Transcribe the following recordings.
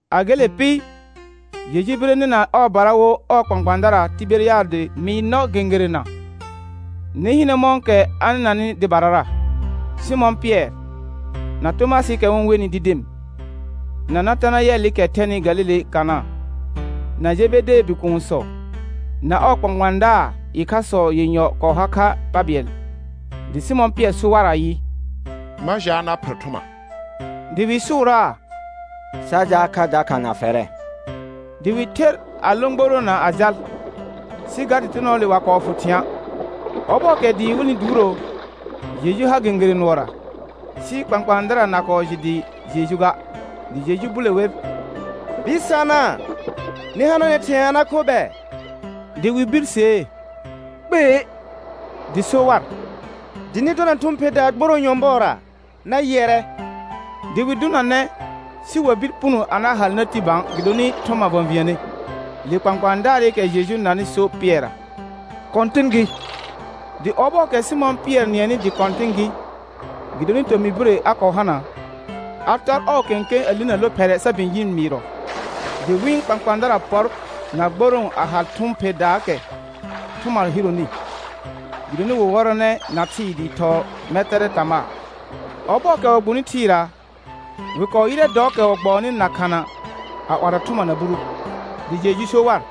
A gele pɩ, Jeju bire nɩna ɔɔbara wo ɔɔ kpãkpãadara Tɩbɛrɩadɩ mɩɩr nɔ gẽgerena. Nɩ hɩnɛ mɔ̃kɛ a nɩnanɩ dɩbarara. Sɩmɔ̃ Pɩɛr, na Tomasɩɩkɛ wɩ-n wenɩ Didim, na Natanayɛlɩkɛ thɛnɩ Galile Kana, na Jebedee bikuunsɔ, na ɔɔ kpãkpãadaar ɩkhasɔ yenyɔ kɔɔ har kha pa bɩɛl. Dɩ Sɩmɔ̃ Pɩɛr so war ayɩ: Ma jaal na pher thʋma. Dɩ wɩ sʋʋraa: Sa jaal kha dakha na fɛrɛ. Dɩ wɩ ther a lõ gboroona a jal, sɩ ga dɩtɩnɔɔle wa kɔɔ fʋ thɩ̃a'. Ɔbɔɔkɛ dɩɩ wɩlnɩ duuro, Jeju har gẽgerẽ nʋɔra, sɩ kpãkpãadara na kɔɔ jɩ dɩ Jeju ga. Dɩ Jeju bule wer: Bɩsana, nɩ hananɛ thɩ̃ɛ a na kho bɛ? Dɩ wɩ birsee: Kpei. Dɩ so war: Dɩ nɩ dɔna thʋ̃ pherdaa gborõ nyɔ̃bɔɔra, na yɩɛrɛ. Dɩ wɩ dʋnanɛ, sɩ wa bir puno a na hal na ti bã gɩdonɩ thʋma və̃viəne. Le kpãkpãadaarɩkɛ Jeju nanɩ so Pɩɛrra: Kɔ̃tɩn gɩ. Dɩ ɔbɔɔkɛ Sɩmɔ̃ Pɩɛr nɩɛnɩ dɩ Kɔ̃tɩn gɩ, gɩdonɩ tomɩ bire a kɔɔ hana, a tɔr ɔɔ kẽkẽ a linə lophɛrɛ sa bɩ̃ ji mɩɩrɔ. Dɩ wɩ̃ kpãkpãadara pɔr na gborõo a hal thʋ̃ pherdaakɛ thʋma hironi, gɩdonɩ wɩ wɔrɔnɛ na thɩɩ dɩɩ thɔɔ mɛtɛrɛ tamaa. Ɔbɔɔkɛ wɩ gbuni thɩɩra, wɩ kɔɔ yɩrɛ dɔɔkɛ wɩ gbɔɔnɩ na khana a 'warɔ thʋma na buru, dɩ Jeju so war: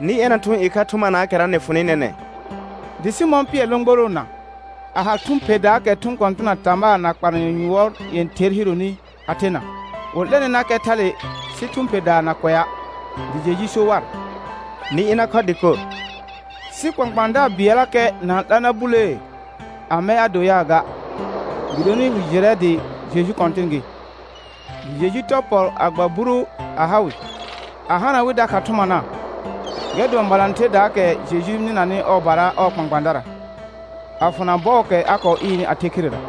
Nɩ ɛna thʋ̃ ɩkha thʋmanaakɛra nɩ fʋnɩ nɛnɛ̃. Dɩ Sɩmɔ̃ Pɩɛr lõ gboroona, a hal thʋ̃ pherdaakɛ thʋ̃ kɔ̃tɩna tamaa na kpalanyɔ yʋɔr yẽther hironi a thena, wɩ 'lɛnɩnakɛ thale sɩ thʋ̃ pherdaa na kʋɛa'. Dɩ Jeju so war: Nɩ ɩna khɔ dɩkor. Sɩ kpãkpãadaar bɩɛllakɛ na-n 'la na bulee, amɛ a do yaa ga, gɩdonɩ wɩ jɩrɛ dɩ Jeju Kɔ̃tɩn gɩ. Dɩ Jeju tɔr pɔ a gba buru a ha wɩ, a hana wɩ dakha thʋmana. Gɛr dʋɔn balãtherdaakɛ Jeju nɩnanɩ ɔɔbara ɔɔ kpãkpãadara, a fʋna bɔɔkɛ a kɔɔ ɩɩrnɩ a the khirera.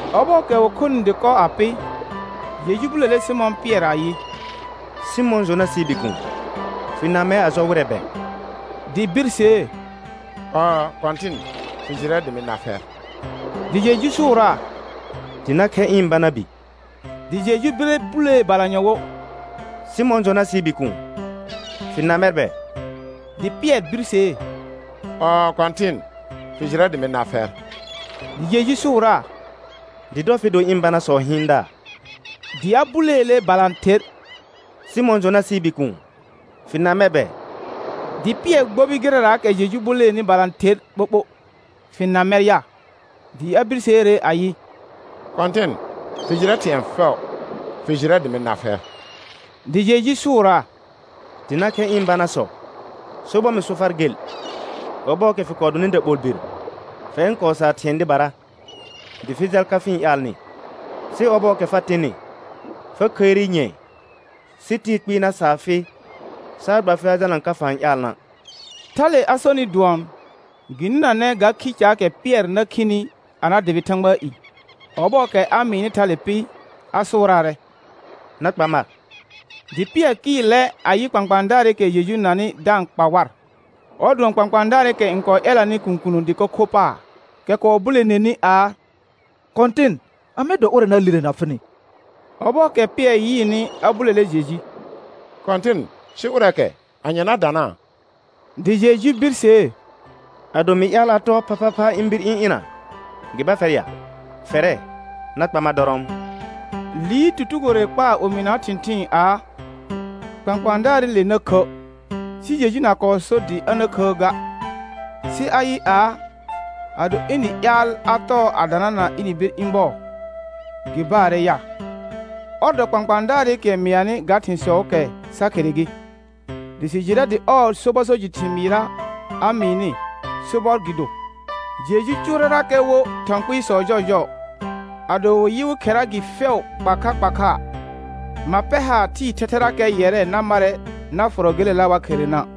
Ɔbɔɔkɛ wɩ khonɩ dɩkɔ a pɩ, Jeju bulele Sɩmɔ̃ Pɩɛr ayɩ: Sɩmɔ̃ Jonasɩɩ bikuun, fɩ na mɛr a jɔ wɩrɛ bɛ? Dɩ birsee: Ɔɔ Kɔ̃tɩn, fɩ jɩrɛ dɩ mɩ na fɛr. Dɩ Jeju sʋʋraa: Dɩ na khɛ ɩ̃ bana bi. Dɩ Jeju bire bulee balanyɔ wo: Sɩmɔ̃ Jonasɩɩ bikuun, fɩ na mɛr bɛ? Dɩ Pɩɛr birsee: Ɔɔ Kɔ̃tɩn, fɩ jɩrɛ dɩ mɩ na fɛr. Dɩ Jeju sʋʋraa: Dɩ dɔ fɩ do ɩ̃ banasɔɔ hɩɩndaar. Dɩ a buleele balãther: Sɩmɔ̃ Jonasɩɩ bikuun, fɩ na mɛr bɛ? Dɩ Pɩɛr gbobi gɩrɛraakɛ Jeju buleeni balãther ɓoɓo: Fɩ na mɛr ya? Dɩ a birseere ayɩ: Kɔ̃tɩn, fɩ jɩrɛ thɩ̃ɛ fɛʋ. Fɩ jɩrɛ dɩ mɩ na fɛr. Dɩ Jeju sʋʋraa: Dɩ na khɛ ɩ̃ banasɔ. Sobɔr mɩ so far gel, ɔbɔɔkɛ fɩ kɔɔ donɩ daɓolbir fɛr n kɔɔ saa thɩ̃ɛ dɩbara, dɩ fɩ jal ka fɩ-n ƴaalnɩ. Sɩ ɔbɔɔkɛ fa tɩnɩ fa khəire nyɛ̃ɛ, sɩ tɩɩ kpɩɩ na saa fɩ saa gba fɩ a jalna ka fa-n ƴaalna'. Thale a sonɩ dʋɔn, gɩ nɩnanɛ ga khi caakɛ Pɩɛr na khini a na dʋbɩ Thãgbaa i. Ɔbɔɔkɛ a mɩɩnɩ thale pɩ a sʋʋraarɛ: Na kpa mar. Dɩ Pɩɛr kɩɩlɛ a yɩ kpãkpãadaarɩkɛ Jeju nanɩ da-n kpa war, ɔr dʋɔn kpãkpãadaarɩkɛ n kɔɔ ƴɛlanɩ kũkunə dɩko kho paar, kɛ kɔɔ buleneni aa: Kɔ̃tɩn, amɛ dɔ ʋrɛ na lirena fɩnɩ? Ɔbɔɔkɛ Pɩɛr yɩɩnɩ a bulele Jeju: Kɔ̃tɩn, sɩ ʋrɛɛkɛ, anye na danaa? Dɩ Jeju birsee: Ado mɩ ƴaal a tɔɔ phaphapha ɩ̃ bir ɩ̃ ɩna, gɩ ba fɛr ya? Fɛrɛ, na kpa mar dɔrɔɔm. Liir tutugore kpaar omɩnaa thɩ̃thɩɩn aa: Kpãkpãadaarɩle na khə'. Sɩ Jeju na kɔɔ so dɩ a na khəə ga, sɩ ayɩ aa, ado ɩnɩ ƴaal a tɔɔ a danana ɩnɩ bir ɩ̃ bɔɔ, gɩ baarɛ ya? Ɔr dɔ kpãkpãadaarɩkɛ mɩanɩ ga thɩ̃sɔɔkɛ sa khere gɩ. Dɩ sɩ jɩrɛ dɩ ɔɔ sobɔ so jɩ thɩmɩɩra a mɩɩnɩ, sobɔr gɩ do. Jeju cʋʋrɛrakɛ wo thɔ̃ kpɩɩsɔ jɔɔjɔɔ. Ado wɩ yɩ wɩ khera gɩ fɛʋ kpa kha kpa kha, ma pɛr haar thɩɩ thɛthɛfɛkɛrakɛ yɛrɛ na marrɛ na fʋrɔ gelela wa kherena'.